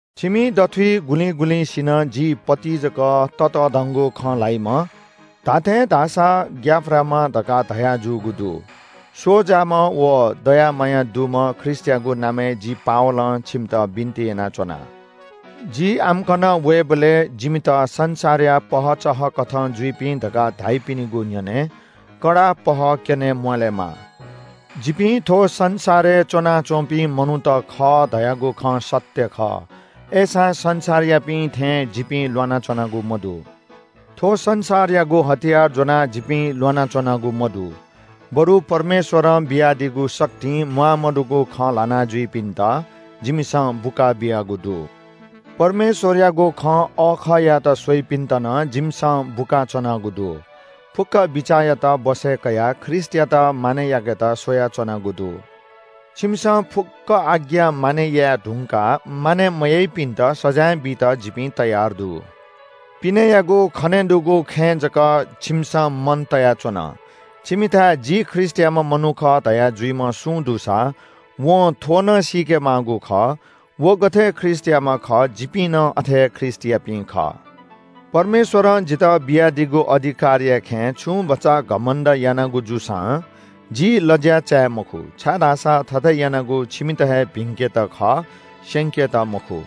छिमि दथुइ गुलिं गुलिंसिनं जि पौलय्‌ जक ततःधंगु खँ ल्‍हाइम्‍ह, धात्‍थें धाःसा ग्‍याफ्राम्‍ह धकाः धयाजूगु दु। स्‍वजाम्‍ह व दया माया दुम्‍ह ख्रीष्‍टयागु नामय् जि पावलं छिमित बिन्‍ति यानाच्‍वना, जि आम्‍कन वयेबलय् जिमित संसारया पहःचहःकथं जुइपिं धकाः धाइपिनिगु न्‍ह्यःने कडा पहः क्‍यने म्‍वाःलेमा। जिपिं थ्‍व संसारय् च्‍वनाच्‍वंपिं मनूत खः धयागु खँ सत्‍य खः, अय्‌सां संसारयापिं थें जिपिं ल्‍वानाच्‍वनागु मदु। थ्‍व संसारयागु हतियार ज्‍वनाः जिपिं ल्‍वानाच्‍वनागु मदु, बरु परमेश्‍वरं बियादीगु शक्तिं म्‍वाःमदुगु खँ ल्‍हानाजुइपिन्‍त जिमिसं बुकाबियागु दु। परमेश्‍वरयागु खँ अःखः यायेत स्‍वइपिन्‍त नं जिमिसं बुकाच्‍वनागु दु। फुक्‍क बिचाःयात बसय् कयाः ख्रीष्‍टयात मानय् याकेत स्‍वयाच्‍वनागु दु। छिमिसं फुक्‍क आज्ञा मानय् याये धुंकाः मानय् मयाइपिन्‍त सजाँय बीत जिपिं तयार दु। पिनेयागु खनेदुगु खँय् जक छिमिसं मन तयाच्‍वन। छिमिथाय् “जि ख्रीष्‍टयाम्‍ह मनू खः” धया जुइम्‍ह सुं दुसा वं थ्‍व नं सीके माःगु खः – व गथे ख्रीष्‍टयाम्‍ह खः जिपिं नं अथे हे ख्रीष्‍टयापिं खः। परमेश्‍वरं जितः बियादीगु अधिकारया खँय् छुं भचा घमण्‍ड यानागु जूसां जि लज्‍या चाये मखु, छाय्‌धाःसा थथे यानागु छिमित हे भिंकेत खः, स्‍यंकेत मखु।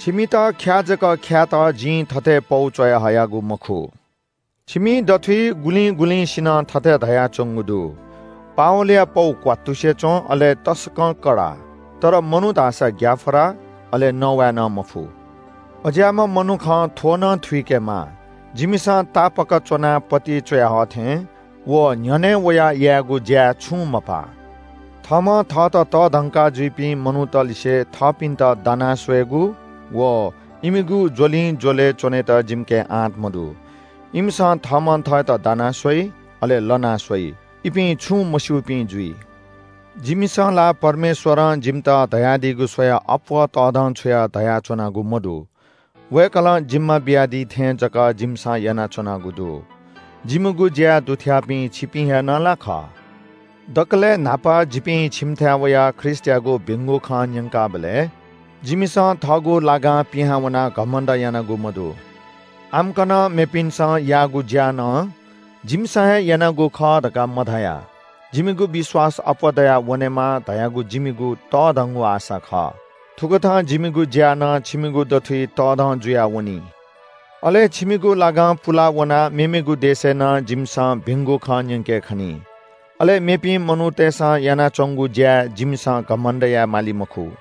छिमित ख्‍या जक ख्‍यायेत जिं थथे पौ च्‍वयाहयागु मखु। छिमि दथुइ गुलिं गुलिंसिनं थथे धयाच्‍वंगु दु – “पावलया पौ क्‍वात्तुसे च्‍वं, अले तसकं कडा। तर मनू धाःसा ग्‍याफ्रा, अले नवाये नं मफु।” अज्‍याःम्‍ह मनुखं थ्‍व नं थुइकेमाः – जिमिसं तापाक च्‍वनाः पौलय्‌ च्‍वयाहः थें व न्‍ह्यःने वयाः यायेगु ज्‍याय् छुं मपाः। थःम्‍हं थःत तःधंका जुइपिं मनूतलिसे थःपिन्‍त दाना स्‍वयेगु व इमिगु ज्‍वलिंज्‍वलय् च्‍वनेत जिमिके आँट मदु। इमिसं थःम्‍हं थःत दाना स्‍वइ, अले लना स्‍वइ। इपिं छुं मस्‍यूपिं जुइ। जिमिसं ला परमेश्‍वरं जिमित धयादीगु स्‍वयाः अप्‍वः तःधंछुयाः धयाच्‍वनागु मदु। वय्‌कलं जिम्‍मा बियादी थें जक जिमिसं यानाच्‍वनागु दु। जिमिगु ज्‍याय् दुथ्‍याःपिं छिपिं हे नं ला खः। दकलय् न्‍हापा जिपिं छिमिथाय् वयाः ख्रीष्‍टयागु भिंगु खँ न्‍यंकाबलय् जिमिसं थःगु लागां पिहां वनाः घमण्‍ड यानागु मदु। आम्‍कन मेपिन्‍सं याःगु ज्‍या नं जिमिसं हे यानागु खः धकाः मधया। छिमिगु विश्‍वास अप्‍वः दयावनेमा धयागु जिमिगु तःधंगु आशा खः। थुकथं जिमिगु ज्‍या नं छिमिगु दथुइ तःधं जुयावनी। अले छिमिगु लागां पुला वनाः मेमेगु देशय् नं जिमिसं भिंगु खँ न्‍यंके खनी। अले मेपिं मनूतय्‌सं यानाच्‍वंगु ज्‍याय् जिमिसं घमण्‍ड याये माली मखु।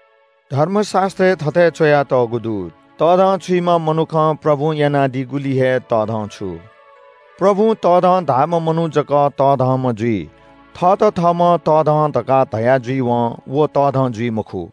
धर्मशास्‍त्रय् थथे च्‍वयातःगु दु “तःधंछुइम्‍ह मनुखं प्रभुं यानादीगुलिइ हे तःधंछु।” प्रभुं तःधं धाःम्‍ह मनू जक तःधंम्‍ह जुइ, थःत थःम्‍हं तःधं धकाः धया जुइवं व तःधं जुइ मखु।